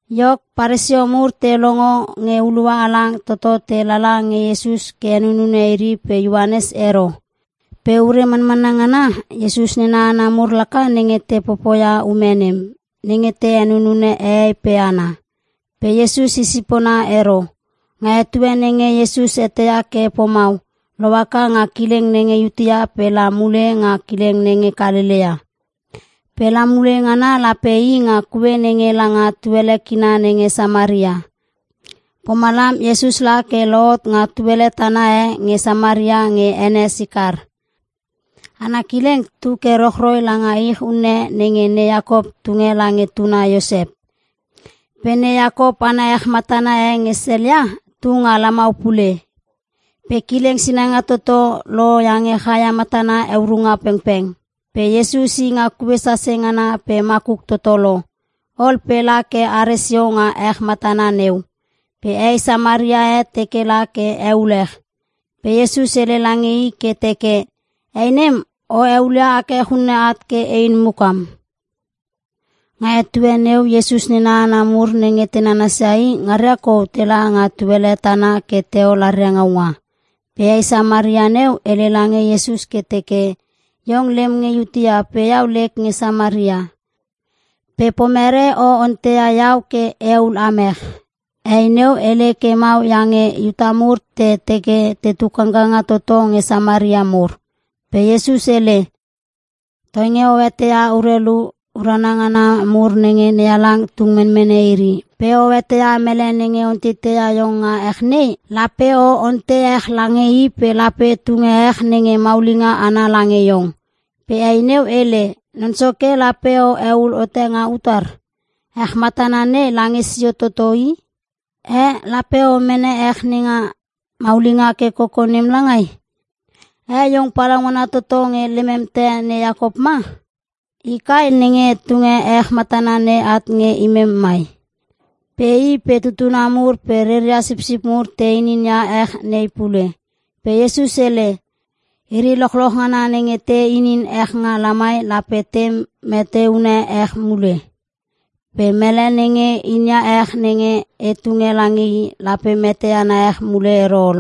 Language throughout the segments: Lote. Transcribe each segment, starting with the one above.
Iok, Paresio mur te longo nge hulua halang toto te lala nge Iesus ke henunune iri pe Ioanes ero. Pe ure manmanna ngana, Iesus nena hana mur laka nenge te popoia ume nem, nenge te henunune hehei pe hana. Pe Iesus i sipona ero. Nga etue nenge Iesus eteia ke pomau, lohaka nga kileng nenge Iutea pe la mule nga kileng nenge Kalelea. Pe la mule ngana lape i nga kue nenge langa tuele kina nenge Samaria. Pomalam Iesus la ke lohot nga tuele tana e nge Samaria nge ene Sikar. Ana kileng tu ke rochroi langa ich unne nenge ne Iakop tunge lange tuna Iosep. Pe ne Iakop ana ech matana e nge sel ia, tu nga lamau pule. Pe kileng sinanga toto lo iange chaia matana heurunga pengpeng. Pe Iesus i nga kue sase ngana pe makuk toto lo. Ol pe la ke are sio nga ech matana neu. Pe hei Samaria e teke la ke eul ech, pe Iesus hele lange i ke teke, “Hei nem o eulia ech unne at ke ein mukam?” (Nga etue neu Iesus nena hana mur nenge te nananas ia i, ngaria kou tela nga tuele tana ke teol aria ngaunga.) Pe hei Samaria neu hele lange Iesus ke teke, “Iong lem nge Iutea pe iau lek nge Samaria. Pe pomerei o onteia iau ke e eul am ech?” (Hei neu hele ke mau iange Iuta mur te teke te tu kangkanga toto nge Samaria mur.) Pe Iesus hele, “Toinge o eteia urelu urana ngana mur nenge NeHalang tung menmene iri, pe o eteia mele nenge onteiteia iong nga ech nei, lape o ontei ech lange i pe lape tunge ech nenge maulinga ana lange iong.” Pe hei neu hele, “Non Soke, lape o eul hote nga utar? Ech matana nei lange sio toto i. Eh, lape o mene ech nenga maulinga ke koko nem langai? Eh iong palaungana toto nge lemem te ne Iakop ma? I kai nenge tunge ech matana nei at nge imem mai. Pe i pe tutuna mur pe reria sipsip mur te inin ia ech nei pule.” Pe Iesus hele, “Iri lochloch ngana nenge te inin ech nga lamai lape te meteune ech mule. Pe mele nenge inia ech nenge e tunge lange i, lape mete ana ech mule ero ol.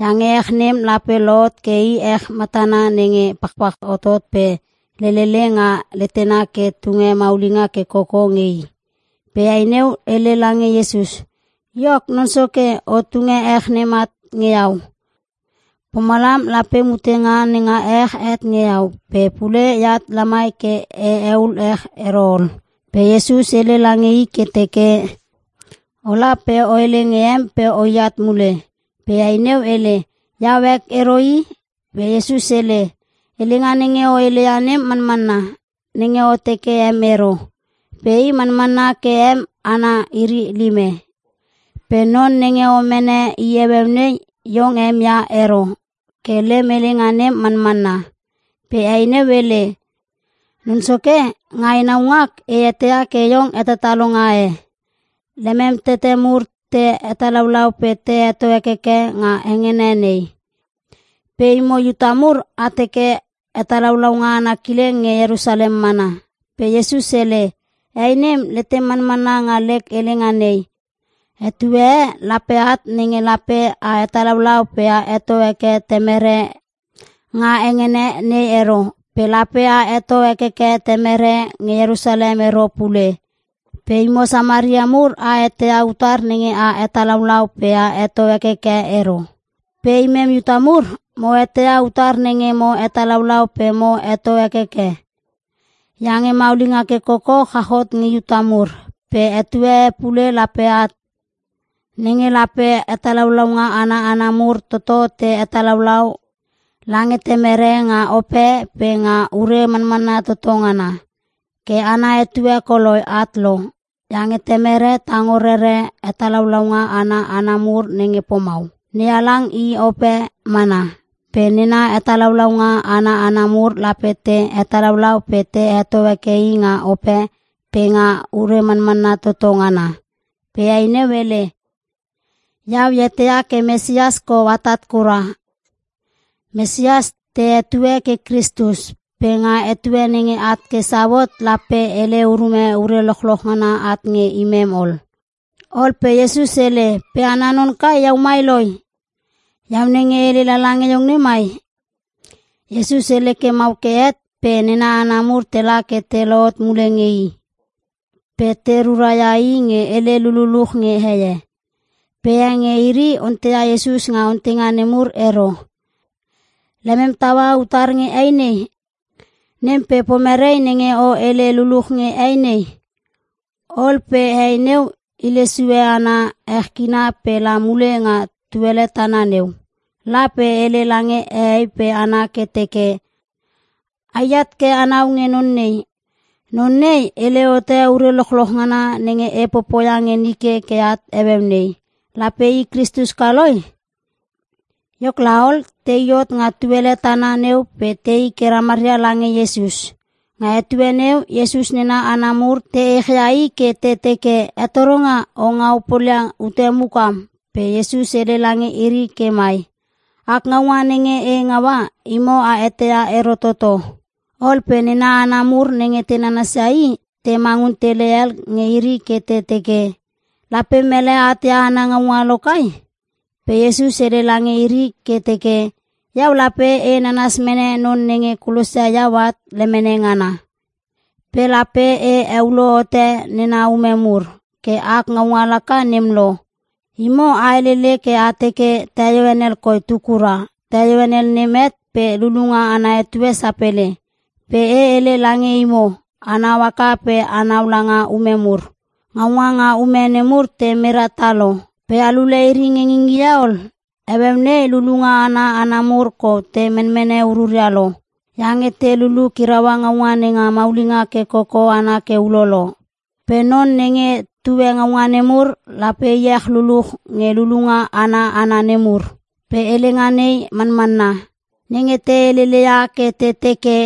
Iange ech nem lape lohot ke i ech matana nenge pachpach hotot pe lelele nga letena ke tunge maulinga ke koko nge i.” Pe hei neu hele lange Iesus, “Iok, Non Soke o tunge ech nem at nge iau. Pomalam lape mutenga nenga ech het nge iau, pe pule eat lamai ke e eul ech ero ol.” Pe Iesus hele lange i ke teke, “Ola pe o hele nge em pe oi at mule.” Pe hei neu hele, “Iau ek ero i.” Pe Iesus hele, “Helenga nenge o heleia nem manmanna, nenge o teke em ero. Pe i manmanna ke em hana iri lime. Pe non nenge o mene i heueu nei, iong em ia ero. Ke lem helenga nem manmanna.” Pe hei neu hele, “Non Soke, nga enau ngak e eteia ke iong hetatalonga e. Lemem tete mur te hetalaulau pe te heto hekeke nga hengene nei. Pe imo Iuta mur a teke hetalaulaunga ana kileng nge Ierusalem mana.” Pe Iesus hele, “Hei nem, letem manmanna nga lek helenga nei. Etue e lape at nenge lape a hetalaulau pe a heto heke Temere nga hengene nei ero. Pe lape a heto hekeke Temere nge Ierusalem ero pule. Pe imo Samaria mur a eteia utar nenge a hetalaulau pe a heto hekeke ero. Pe imem Iuta mur mo eteia utar nenge mo hetalaulau pe mo heto hekeke. Iange maulinga ke koko chach hot nge Iuta mur. Pe etue e pule lape at, nenge lape hetalaulaunga ana hana mur toto te hetalaulau lange Temere nga ope pe nga ure manmanna toto ngana. Ke ana etue koloi at lo. Iange Temere tango rerere hetalaulaunga ana hana mur nenge pomau. NeHalang i ope mana, pe nena hetalaulaunga ana hana mur lape te hetalaulau pe te heto heke i nga ope pe nga ure manmanna toto ngana.” Pe hei neu hele, “Iau e eteia ke Mesias kou atat kura.” (Mesias te hetue ke Kristus). “Pe nga etue nenge at ke sau hot, lape hele urume ure lochloch ngana at nge imem ol.” Ol pe Iesus hele, “Pe ana non kai iau mai loi, iau nenge e hele lala nge iong nei mai.” Iesus hele ke mau ke het pe nena hana mur tela ke te lohot mule nge i. Pe te rura ia i nge hele lululuch nge heie. Pe e nge iri onteia Iesus nga onteinga nemur ero: “Lemem taua utar nge hei nei” nem pe “Pomerei nenge o hele luluch nge hei nei?” Ol pe hei neu hile sue ana ech kina pe la mule nga tuele tana neu. La pe hele lange hehei pe hana ke teke, “Ai at ke anau nge Non nei. Non nei hele hote ure lochloch ngana nenge e popoia nge nike ke at heueu nei. Lape i Kristus ka loi?” Iok laol, tei hot nga tuele tana neu pe tei ke ramaria lange Iesus. Nga etue neu Iesus nena hana mur te echia i ke te teke, “Hetoronga, o ngau polia ute mukam.” Pe Iesus hele lange iri ke mai, “Ak ngaunga nenge e ngaua, imo a eteia ero toto.” Ol pe nena hana mur nenge te nananas ia i, te mangun tele hel nge iri ke te teke, “Lape mele at ia ana ngaunga lo kai?” Pe Iesus hele lange iri ke teke, “Iau lape e nanas mene Non nenge kulosia iau at lemene ngana. Pe lape e heulo hote nena ume mur. Ke ak ngaunga laka nem lo. Imo a helele ke a teke, ‘Teio henel koi tu kura. Teio henel nem het pe lulunga ana etue sapele.’ Pe e hele lange imo, anau haka pe anau langa ume mur! Ngaunga nga ume nemur te mera tah lo. Pe a lule iri nge ngingie ol? Heueu nei lulunga ana hana mur kou te menmene ururia lo. Iange te lulu kiraua ngaunga nenga maulinga ke koko ana ke ulolo. Pe non nenge tue ngaunga nemur lape iech luluch nge lulunga ana hana nemur. Pe helenga nei manmanna. Nenge te helele ia ke te teke,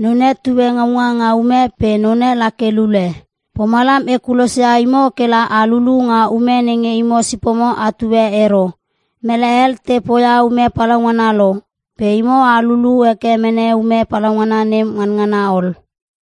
‘Non e tue ngaunga nga ume pe none la ke lule.’ Pomalam e kulosia imo kela a lulu nga ume nenge imo sipomo atue ero. Mele hel te poia ume palaungana lo, pe imo a lulu heke mene ume palaungana nem nganangana ol.”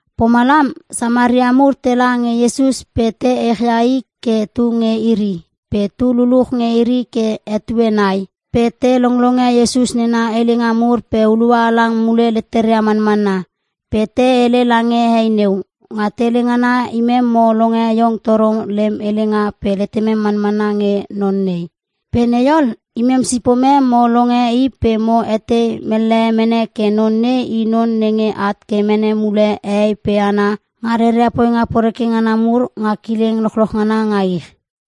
Pomalam Samaria mur tela nge Iesus pe te echia i ke tu nge iri, pe tu luluch nge iri ke etue nai. Pe te longlonge Iesus nena helenga mur pe hulua halang mule leteria manmanna. Pe te hele lange hei neu, “Nga tele ngana, imem mo longe iong toro lem helenga pe letemem manmanna nge Non nei. Pe nei ol, imem sipomem mo longe i pe mo etei mellehe mene ke non nei i non nenge at ke mene mule hehei pe hana nga reria poinga poreke ngana mur, nga kileng lochloch ngana nga ich.”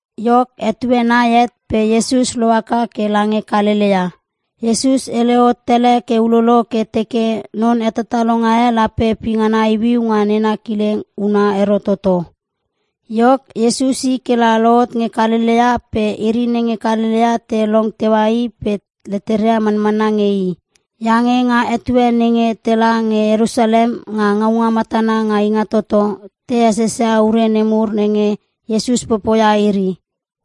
Iok, etue nai het pe Iesus lohaka ke lange Kalelea. (Iesus hele hot tele ke ulolo ke teke non hetatalonga e lape pingana iuiu nga nena kileng huna ero toto.) Iok, Iesus i kela lohot nge Kalelea pe iri nenge Kalelea te long teua i pe leteria manmanna nge i. Iange nga etue nenge tela nge Ierusalem nga ngaunga matana nenga Ingatoto, te esesia ure nemur nenge Iesus popoia iri.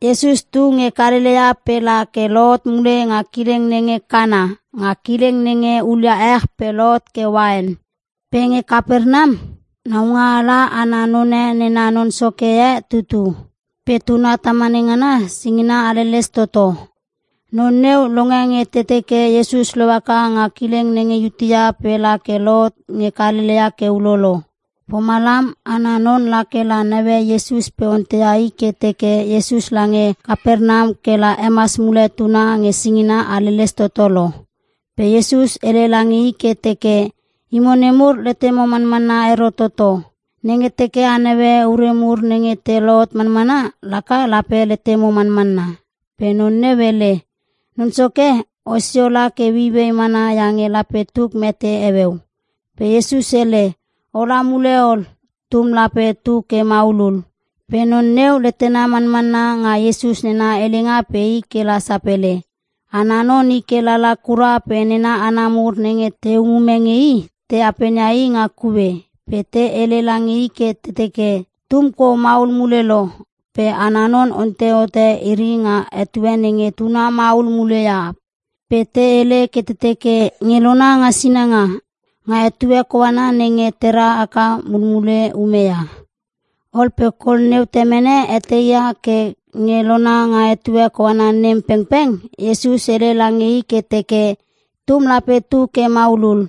Iesus tu nge Kalelea pe la ke lohot mule nga kileng nenge Kana, nga kileng nenge hulia ech pe lohot ke uain. Pe nge Kapernam, naungaala ana none nena non soke e tutu. Pe tuna tamane ngana singina haleles toto. Non neu longe nge te teke Iesus lohaka nga kileng nenge Iutea, pe la ke lohot nge Kalelea ke ulolo. Pomalam, ana non la ke naue Iesus pe onteia i ke teke Iesus lange Kapernam kela hemas mule tuna nge singina haleles toto lo. Pe Iesus hele lange i ke teke, “Imo nemur letemo manmanna ero toto. Nenge teke a naue ure mur nge te lohot manmana, laka lape letemo manmanna.” Pe non neu hele, “Non Soke, osio la ke ueiuei mana iange lape tuk mete heueu.” Pe Iesus hele, “Ola mule ol. Tum lape tu ke maulul.” Pe non neu letena manmanna nga Iesus nena helenga pe i kela sapele. Ana non i ke lala kura pe nena hana mur nenge te umume nge i, te apenia i nga kue. Pe te hele lange i ke te teke, “Tum kou maul mule lo.” Pe ana non ontei hote iri nga etue nenge tuna maula mule ia, pe te hele ke te teke, “Nge lona nga sinanga. Nga etue koana nenge tera haka mulmule ume ia.” Ol pe kol neu temene eteia ke nge lona nga etue koana nem pengpeng, Iesus hele lange i ke teke, “Tum lape tu ke maulul.”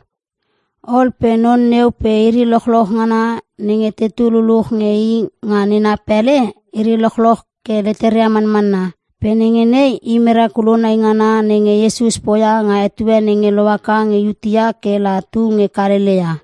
Ol pe non neu pe iri lochloch ngana nenge tetu luluch nge i nga nena pele, iri lochloch ke leteria manmanna. Pe nenge nei i merakulo naingana nenge Iesus poia nga etue nenge lohaka nge Iutea ke la tu nge Kalelea.